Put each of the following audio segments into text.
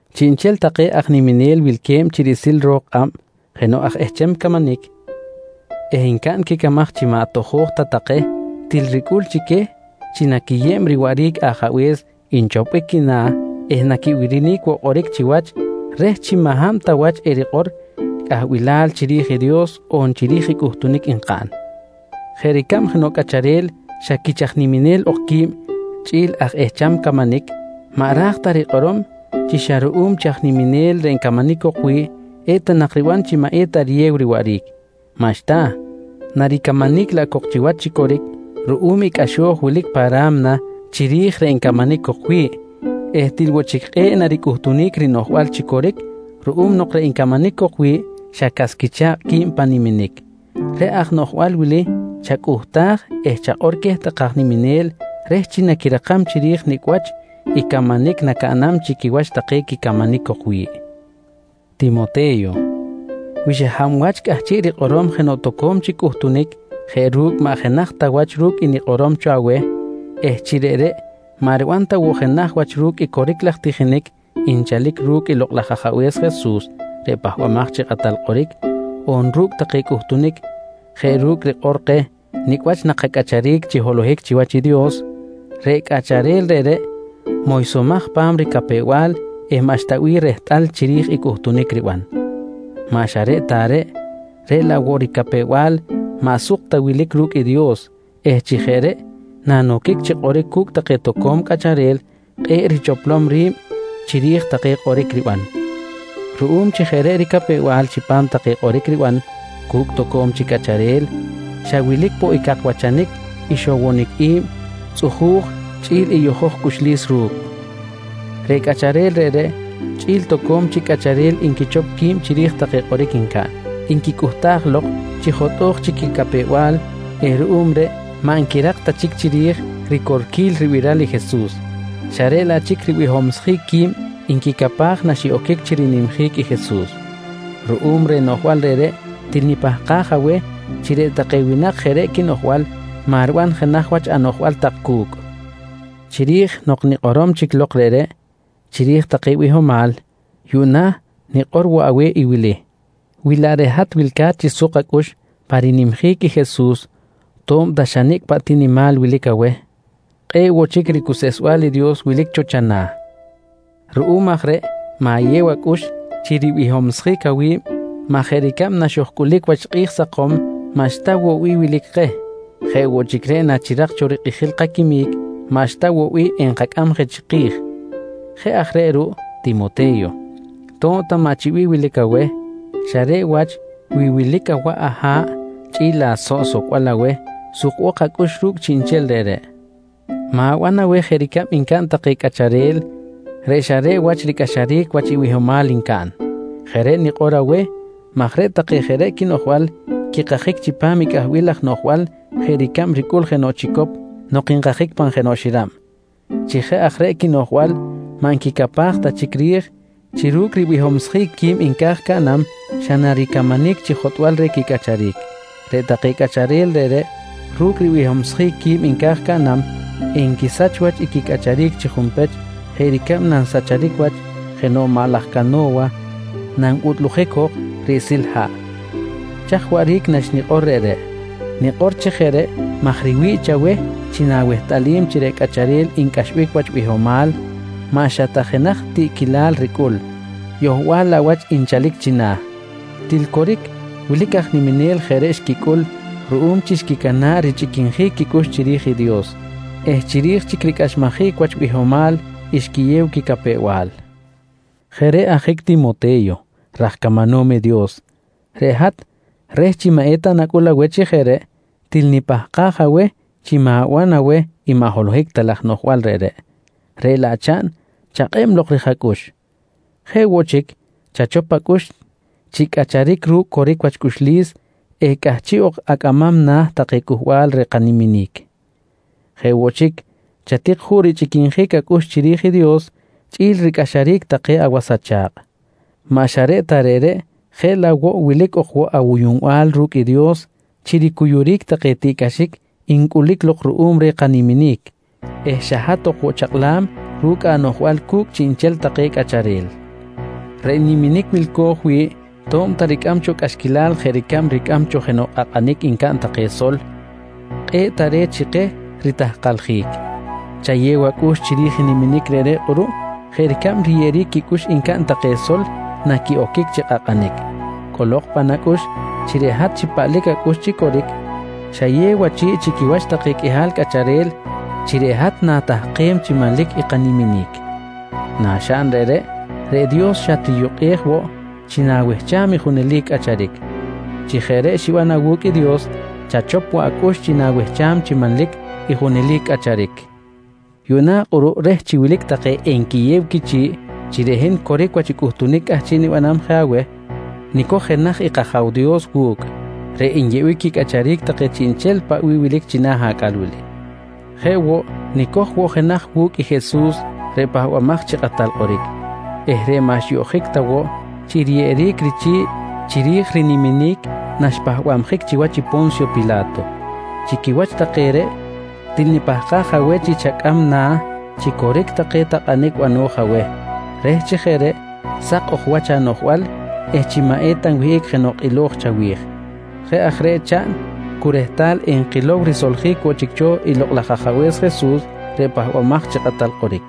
Chiꞌnchel take aj niminel wilque̱b riꞌsil ro̱k kꞌab jenoꞌ aj ehcham camanic eh ncaꞌn quicamaj chi maꞌ tojo̱j ta take til ricꞌul chi queh chi naquiyeb riwaꞌric i ajabe̱s nchopbic quina̱ eh naquibirinic woꞌ kꞌoric chiwach reh chi maꞌ hab ta wach erikꞌor cꞌahbilal chiri̱j i Dios on chiri̱j i cꞌuhtunic nkaꞌn. Jeꞌ ricab jenoꞌ cꞌacharel xa quich aj niminel ok qui̱b chꞌi̱l aj ehcham camanic, maꞌ ra̱j ta rikꞌorom chi xa ruꞌum chi aj niminel reꞌ ncamanic cok wi̱ꞌ, eta nak riban chi maꞌ eta riyew riwaꞌric. Maꞌxta, naricamanic laꞌ cok chiwach chi coric ruꞌum i cꞌaxo̱j wilic pa ra̱mna chiri̱j reꞌ ncamanic cok wi̱ꞌ eh til woꞌ chic kꞌe̱ꞌ naricꞌuhtunic rinoꞌjbal chi coric ruꞌum nok reꞌ ncamanic cok wi̱ꞌ xa cas quicha̱kꞌ qui̱b pan niminic. Reꞌ aj noꞌjbal wili chacꞌuhtaj eh chakꞌor queh take aj niminel reh chi naquirakam chiri̱j nicꞌ wach i camanic nacaꞌnam chi quiwach take quicamanic cok wi̱ꞌ. Timote̱yo, wi xa hab wach cꞌahchiꞌ rikꞌorom jenoꞌ toco̱m chic cꞌuhtunic jeꞌ ru̱cꞌ maꞌ jenaj ta wach ru̱cꞌ i nikꞌorom cho aweh eh chi reꞌreꞌ maꞌ riban ta woꞌ jenaj wach ru̱cꞌ i coric laj tijinic nchalic ru̱cꞌ i Lokꞌ laj Ajabe̱s Jesus reꞌ Pahbamaj chi Kꞌatal Kꞌoric, on ru̱cꞌ take cꞌuhtunic jeꞌ ru̱cꞌ rikꞌor keh nicꞌ wach nakacꞌacharic chi holohic chiwach i Dios, reꞌ cꞌacharel reꞌreꞌ moysomaj pa̱m ricapew-bal eh maꞌxta bih rehtꞌal chiri̱j i cꞌuhtunic riban. Maꞌ xa reꞌ ta reꞌ, reꞌ laꞌ woꞌ ricapew-bal maꞌ suk ta wilic ru̱cꞌ i Dios eh chi jeꞌ reꞌ nanoquic chi kꞌoric cu̱cꞌ take toco̱m cꞌacharel kꞌe̱ꞌ richoplom ri̱b chiri̱j take kꞌoric riban. Ruꞌum chi jeꞌ reꞌ ricapew-bal chipam take kꞌoric riban cu̱cꞌ toco̱m chic cꞌacharel, xa wilic woꞌ i cakwachanic, ixowonic i̱b, tzꞌuju̱j chꞌi̱l i yojoj cꞌuxlis ru̱cꞌ. Reꞌ cꞌacharel reꞌreꞌ chꞌi̱l toco̱m chic cꞌacharel nquichop qui̱b chiri̱j take kꞌoric ncaꞌn, nquicꞌuhtaj lok chi jotꞌo̱j chic quicapew-bal eh ruꞌum reꞌ maꞌ nquirak ta chic chiri̱j ricorquil ribiral i Jesus, xa reꞌ laꞌ chic ribihomsjic qui̱b nquicapaj naxiꞌoquic chi rinimjic i Jesus. Ruꞌum reh noꞌjbal reꞌreꞌ, til nipahkaj aweh chi reꞌ take winak jeꞌ reꞌ quinoꞌjbal maꞌ riban jenaj wach anoꞌjbal tak cu̱cꞌ. Chiri̱j nok nikꞌorom chic lok reꞌreꞌ chiri̱j take bihomal, yuꞌna nikꞌor woꞌ aweh i wili: Wi laꞌ reꞌ hat wilca̱t chi suk acꞌux pan rinimjic i Jesus to̱b ta xa nicꞌ paꞌ ti nimal wilic aweh, kꞌe̱ꞌ woꞌ chic ricuseꞌsbal i Dios wilic cho chana̱. Ruꞌum aj reꞌ ma̱yew acꞌux chi ribihomsjic awi̱b maj jeꞌ ricab naxojcꞌulic wach kꞌi̱j sakom maꞌxta woꞌ bih wilic keh, jeꞌ woꞌ chic reꞌ nachirak cho rikꞌijil kaquimic maꞌxta woꞌ bih enkacꞌam je chiki̱j. Jeꞌ aj reꞌ ruꞌ Timote̱yo, to̱b ta maꞌ chi bih wilic aweh, xa reꞌ wach wi wilic awaꞌ aha̱ꞌ, chꞌi̱l asoꞌ socbal aweh, sukbok acꞌux ru̱cꞌ chiꞌnchel reꞌreꞌ. Ma̱ban aweh jeꞌ ricab encaꞌn take cꞌacharel reꞌ xa reꞌ wach ricꞌaxaric wach bihomal ncaꞌn. Jeꞌ reꞌ nikꞌor aweh maj reꞌ take jeꞌ reꞌ quinoꞌjbal quikajic chipam i cꞌahbilal laj noꞌjbal jeꞌ ricab ricꞌul jenoꞌ chicop nok nkajic pan jenoꞌ xirab. Chi jeꞌ aj reꞌ quinoꞌjbal maꞌ nquicapaj ta chic ri̱j chi ru̱cꞌ ribihomsjic qui̱b nca̱j caꞌnam, xa naricamanic chi jotꞌbal reh quicꞌacharic. Reꞌ take cꞌacharel reꞌreꞌ ru̱cꞌ ribihomsjic qui̱b nca̱j caꞌnam, enquisach wach i quicꞌacharic chi junpech jeꞌ ricab nansahchic wach jenoꞌ maꞌ laj cano̱wa nanbutꞌlujic jok riꞌsil haꞌ. Chaj waꞌric naxnikꞌor reꞌreꞌ? Nikꞌor chi jeꞌ reꞌ maj riwi̱ꞌ chaweh chi nawehtꞌalim chi reꞌ cꞌacharel ncꞌaxbic wach bihomal maꞌ xa ta jenaj i tiꞌquilal ricꞌul, yohbal laꞌ wach nchalic china̱. Til coric wilic take aj niminel jeꞌ reꞌ xquicꞌul ruꞌum chi xquicana̱ꞌ richꞌiquinjic quicꞌux chiri̱j i Dios eh chiri̱j chic ricꞌaxmajic wach bihomal xquiyew quicapew-bal. Jeꞌ reꞌ ajic Timote̱yo raj camanom i Dios, reꞌ hat reh chi maꞌ eta nacꞌul aweh chi jeꞌ reꞌ, til nipahkaj aweh chi ma̱ban aweh i maꞌ holohic ta laj noꞌjbal reꞌreꞌ, reꞌ laꞌ chaꞌn chakꞌeb lok rij acꞌux. Jeꞌ woꞌ chic chachop acꞌux chi cꞌacharic ru̱cꞌ coric wach cꞌuxlis eh cꞌahchiꞌ ok acꞌamam na̱ take cꞌuhbal reh kaniminic. Jeꞌ woꞌ chic chatik juꞌ richꞌiquinjic acꞌux chiri̱j i Dios chꞌi̱l ricꞌaxaric take awas acha̱kꞌ. Maꞌ xa reꞌ ta reꞌreꞌ, jeꞌ laꞌ woꞌ wilic ok woꞌ awuyuꞌnbal ru̱cꞌ i Dios chi ricuyuric take tiꞌcꞌaxic ncꞌulic lok ruꞌum reh kaniminic eh xa hat ok woꞌ chakꞌlam ru̱cꞌ anoꞌjbal cu̱cꞌ chiꞌnchel take cꞌacharel. Reꞌ niminic wilco̱j wi̱ꞌ to̱b ta ricꞌam cho cꞌaxquilal jeꞌ ricab ricꞌam cho jenoꞌ kꞌakꞌanic ncaꞌn take sol, kꞌe̱ꞌ tare̱t chi keh ritahkaljic. Chayew acꞌux chiri̱j i niminic reꞌreꞌ kꞌuruꞌ jeꞌ ricab riyeꞌeric quicꞌux ncaꞌn take sol naquiꞌoquic chi kꞌakꞌanic. Cꞌolok pan acꞌux chi reꞌ hat chi paꞌlic acꞌux chi coric, xayew achi̱ꞌ chi quiwach take qꞌuihal cꞌacharel chi reꞌ hat na̱tahkem chi manlic i kaniminic. Naxaꞌn reꞌreꞌ, reꞌ Dios xatriyukꞌej woꞌ chi na̱wehcham i junelic cꞌacharic. Chi jeꞌ reꞌ xiban awu̱cꞌ i Dios, chachop woꞌ acꞌux chi nawehcham chi manlic i junelic cꞌacharic. Yuꞌna kꞌuruꞌ reh chi wilic take enquiyew quichi̱ꞌ chi reꞌ hin coric wach i cꞌuhtunic cꞌahchiꞌ nibanam je aweh, nicoj jenaj i kAja̱w Dios wu̱cꞌ reꞌ nyeꞌbic quicꞌacharic take chiꞌnchel paꞌ bih wilic china̱ acꞌal wili. Jeꞌ woꞌ nicoj woꞌ jenaj wu̱cꞌ i Jesus reꞌ Pahbamaj chi Kꞌatal Kꞌoric eh reꞌ maꞌ xyoꞌjic ta woꞌ chi riyeꞌeric richi̱ꞌ chiri̱j riniminic naxpahbabjic chiwach i Po̱nsyo Pila̱to. Chi quiwach take reꞌ, til nipahkaj aweh chi chacꞌam na̱ chi coric take takꞌanic bano̱j aweh reh chi jeꞌ reꞌ sak ok wach anoꞌjbal eh chi maꞌ eta nwihꞌic jenoꞌ kꞌilo̱j chawi̱j. Jeꞌ aj reꞌ chaꞌn cu rehtal enkilow risoljic woꞌ chic cho i Lokꞌ laj Ajabe̱s Jesus reꞌ Pahbamaj chi Kꞌatal Kꞌoric.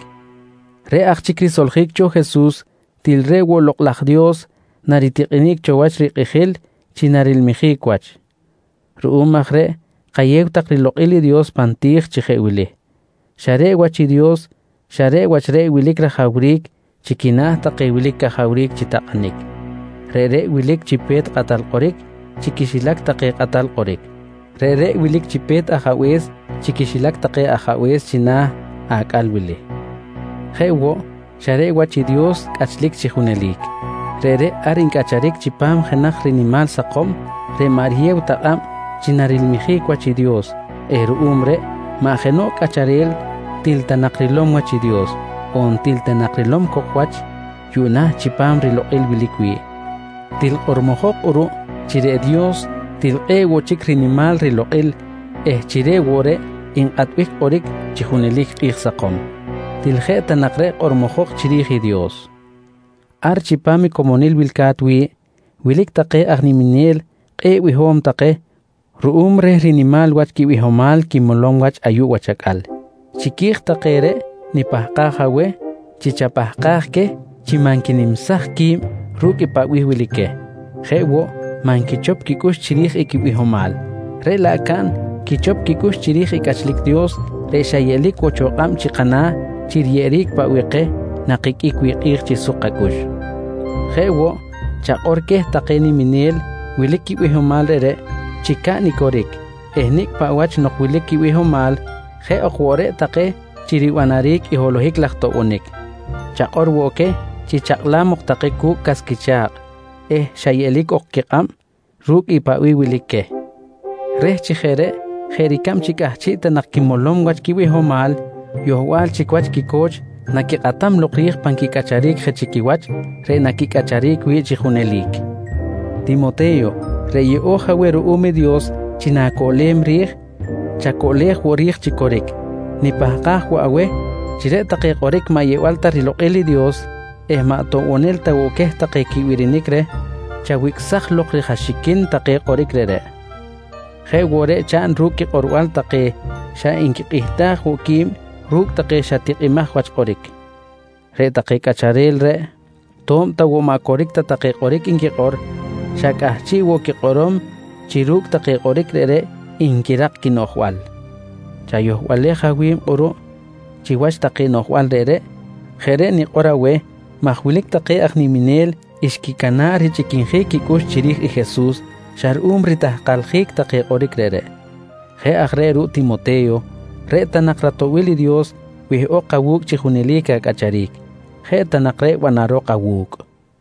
Reꞌ aj chic risoljic cho Jesus, til reꞌ woꞌ i Lokꞌ laj Dios naritikꞌenic cho wach rikꞌijil chi narilmijic wach. Ruꞌum aj reꞌ kayew tak rilokꞌil i Dios pan ti̱j chi jeꞌ wili: Xa reꞌ wach i Dios, xa reꞌ wach reꞌ wilic rajawric chi quina̱ take wilic cajawric chi takꞌanic. Reꞌreꞌ wilic chi pe̱t kꞌatal kꞌoric chi quixilac take kꞌatal kꞌoric. Reꞌreꞌ wilic chi pe̱t kꞌatal kꞌoric chi quixilac take kꞌatal kꞌoric. Reꞌreꞌ wilic chi pe̱t ajabe̱s chi quixilac take ajabe̱s china̱ acꞌal wili. Jeꞌ woꞌ, xa reꞌ wach i Dios cꞌachlic chi junelic. Reꞌreꞌ ar ncꞌacharic chipam jenaj rinimal sakom reꞌ maꞌ riyew ta kꞌab chi narilmijic wach i Dios eh ruꞌum reꞌ maꞌ jenoꞌ cꞌacharel til ta nak rilom wach i Dios, on til ta narilom cok wach yuꞌna chipam rilokꞌil wilic wi̱ꞌ. Til kꞌormojok kꞌuruꞌ chi reꞌ Dios til kꞌe̱ꞌ woꞌ chic rinimal rilokꞌil eh chi reꞌ woꞌ reꞌ nkꞌatbic kꞌoric chi junelic kꞌi̱j sakom. Til jeꞌ ta nak reꞌ kꞌormojok chiri̱j i Dios. Ar chipam comonil wilca̱t wi̱ꞌ, wilic take aj niminel kꞌe̱ꞌ biho̱m take ruꞌum reh rinimal wach quibihomal quimolom wach ayuꞌ wach acꞌal. Chiqui̱j take reꞌ nipahkaj aweh chi chapahkaj queh chi maꞌ nquinimsaj qui̱b ru̱cꞌ paꞌ bih wilic queh jeꞌ woꞌ maꞌ nquichop quicꞌux chiri̱j i quibihomal, reꞌ laꞌ caꞌn quichop quicꞌux chiri̱j i cꞌachlic Dios reꞌ xa yeꞌlic woꞌ cho kꞌab chi kana̱ chi riyeꞌeric paꞌ bih keh nakiqꞌuic wi̱ꞌ kꞌi̱j chi suk kacꞌux. Jeꞌ woꞌ, chakꞌor queh take niminel wilic quibihomal reꞌreꞌ chi caꞌn i coric eh nicꞌ paꞌ wach nok chi wilic quibihomal jeꞌ ok woꞌ reꞌ take chi ribanaric i holohic laj toꞌbonic. Chakꞌor woꞌ queh chi chakꞌlam ok take cu̱cꞌ cas quicha̱kꞌ eh xa yeꞌlic ok quikꞌab ru̱cꞌ i paꞌ bih wilic queh reh chi jeꞌ reꞌ jeꞌ ricab chi cꞌahchiꞌ ta nak quimolom wach quibihomal, yohbal chic wach quico̱ch naquikꞌatam lok ri̱j pan quicꞌacharic je chi quiwach reꞌ naquicꞌacharic wi̱ꞌ chi junelic. Timote̱yo, reꞌ yeꞌo̱j aweh ruꞌum i Dios chi na̱coꞌlem ri̱j, chacoꞌlej woꞌ ri̱j chi coric. Nipahkaj woꞌ aweh chi reꞌ take kꞌoric maꞌ yeꞌbal ta rilokꞌil i Dios eh maꞌ toꞌbonel ta woꞌ queh take quibirinic reh, chawicꞌsaj lok ri̱j axiquin take kꞌoric reꞌreꞌ. Jeꞌ woꞌ reꞌ chaꞌn ru̱cꞌ quikꞌorbal take xa nquikꞌihtaj woꞌ qui̱b ru̱cꞌ take xa tikꞌimaj wach kꞌoric. Reꞌ take cꞌacharel reꞌ, to̱b ta woꞌ maꞌ coric ta take kꞌoric nquikꞌor, xa cꞌahchiꞌ woꞌ quikꞌorom chi ru̱cꞌ take kꞌoric reꞌreꞌ nquirak quinoꞌjbal. Chayohbalej awi̱b kꞌuruꞌ chiwach take noꞌjbal reꞌreꞌ. Jeꞌ reꞌ nikꞌor aweh maj wilic take aj niminel xquicana̱ꞌ richꞌiquinjic quicꞌux chiri̱j i Jesus xa ruꞌum ritahkaljic take kꞌoric reꞌreꞌ. Jeꞌ aj reꞌ ruꞌ Timote̱yo, reꞌ ta nak ratoꞌbil i Dios wihꞌok awu̱cꞌ chi junelic acꞌacharic. Jeꞌ ta nak reꞌ banarok awu̱cꞌ.